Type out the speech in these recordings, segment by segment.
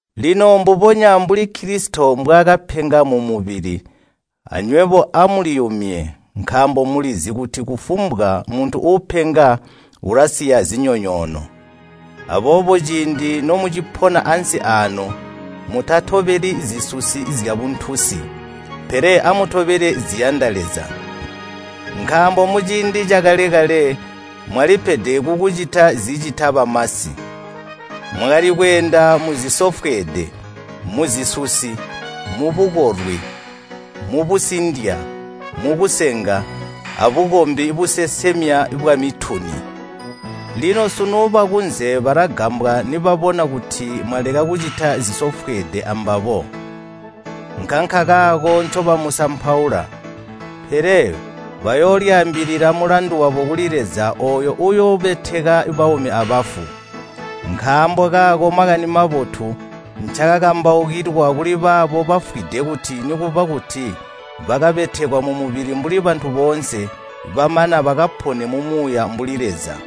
Lino mbubonya mbuli Kilisito mbwaakapenga mumubili, anywebo amuliyumye, nkaambo mulizi kuti kufumbwa muntu uupenga ulasiya zinyonyoono. Aboobo ciindi nomucipona ansi aano mutatobeli zisusi zyabuntunsi, pele amutobele ziyanda Leza. Nkaambo muciindi cakale-kale mwalipede kukucita zicita bamasi. Mwakali kweenda muzisofweede, muzisusi, mubukolwi, mubusindya, mukusenga, abukombi busesemya bwamituni. Lino sunu bakunze balagambwa nibabona kuti mwaleka kucita zisofwede ambabo, nkankakaako ncobamusampaula. Pele bayoolyaambilila mulandu wabo kuli Leza ooyo uuyoobeteka baumi abafu. Nkaambo kaako Makani Mabotu ncaakakambaukilwa kuli baabo bafwide kuti nikuba kuti bakabetekwa mumubili mbuli bantu boonse, bamana bakapone mumuuya mbuli Leza.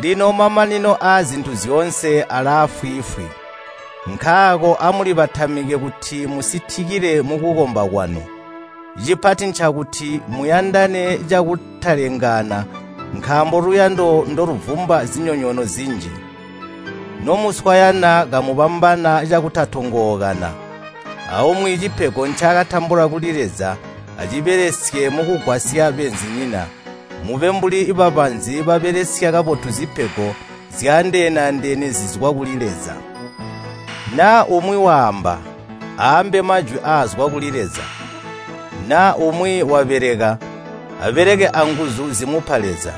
Lino mamanino aazintu zyoonse alaafwiifwi. Nkaako amulibatamike kuti musitikile mukukomba kwanu. Cipati ncakuti muyandane cakutalengaana nkaambo luyando ndoluvumba zinyonyoono zinji. Nomuswayana kamubambana cakutatongookana. Aumwi cipego ncaakatambula kuli Leza acibelesye mukugwasya beenzinyina. Mube mbuli babanzi babelesya kabotu zipego zyaandeene-andeene zizwa kuli Leza. Naa umwi waamba, aambe majwi aazwa kuli Leza. Naa umwi wabeleka, abeleke anguzu zimupa Leza,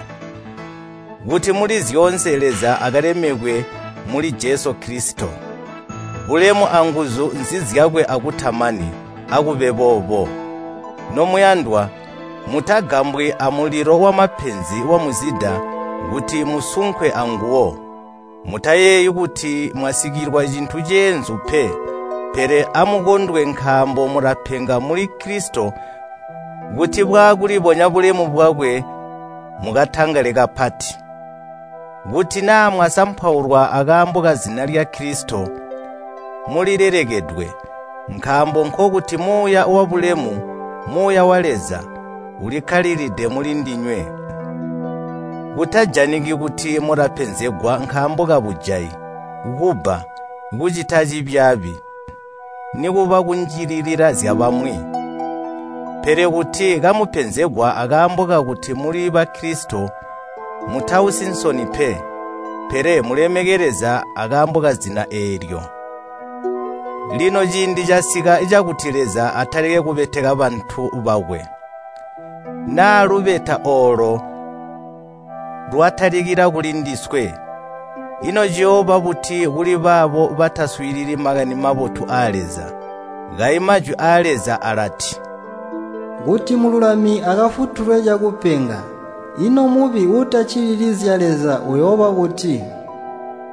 kuti muli zyoonse Leza akalemekwe muli Jesu Kilisito. Bulemu anguzu nzizyakwe akutamani. Akube boobo. Nomuyandwa, mutagambwi amulilo wamapenzi wamuzida kuti musunkwe anguwo. Mutayeeyi kuti mwasikilwa cintu ceenzu pe. Pele amukondwe nkaambo mulapenga mbuli Kilisito kuti bwaakulibonya bulemu bwakwe mukatangale kapati. Kuti naa mwasampaulwa akaambo kazina lya Kilisito, mulilelekedwe, nkaambo nkokuti Muuya wabulemu, Muuya wa Leza, ulikkalilide mulindinywe. Kutajaniki kuti mulapenzegwa nkaambo kabujayi, kubba, kucita cibyaabi, nikuba kunjililila zyabamwi. Pele kuti kamupenzegwa akaambo kakuti muli Bakilisito mutausi nsoni pe, pele mulemeke Leza akaambo kazina eelyo. Lino ciindi casika cakuti Leza atalike kubeteka bantu bakwe. Naa lubeta oolo lwatalikila kulindiswe, ino ciyooba buti kuli baabo bataswiilili Makani Mabotu aa Leza? Kayi Majwi aa Leza alati, “Kuti mululami akafutulwe cakupenga, ino mubi uutaccilili zya Leza uyooba buti?”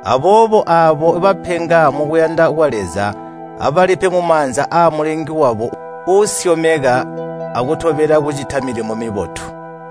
Aboobo aabo bapenga mukuyanda kwa Leza abalipe mumaanza aa Mulengi wabo uusyomeka akutolelela kucita milimo mibotu.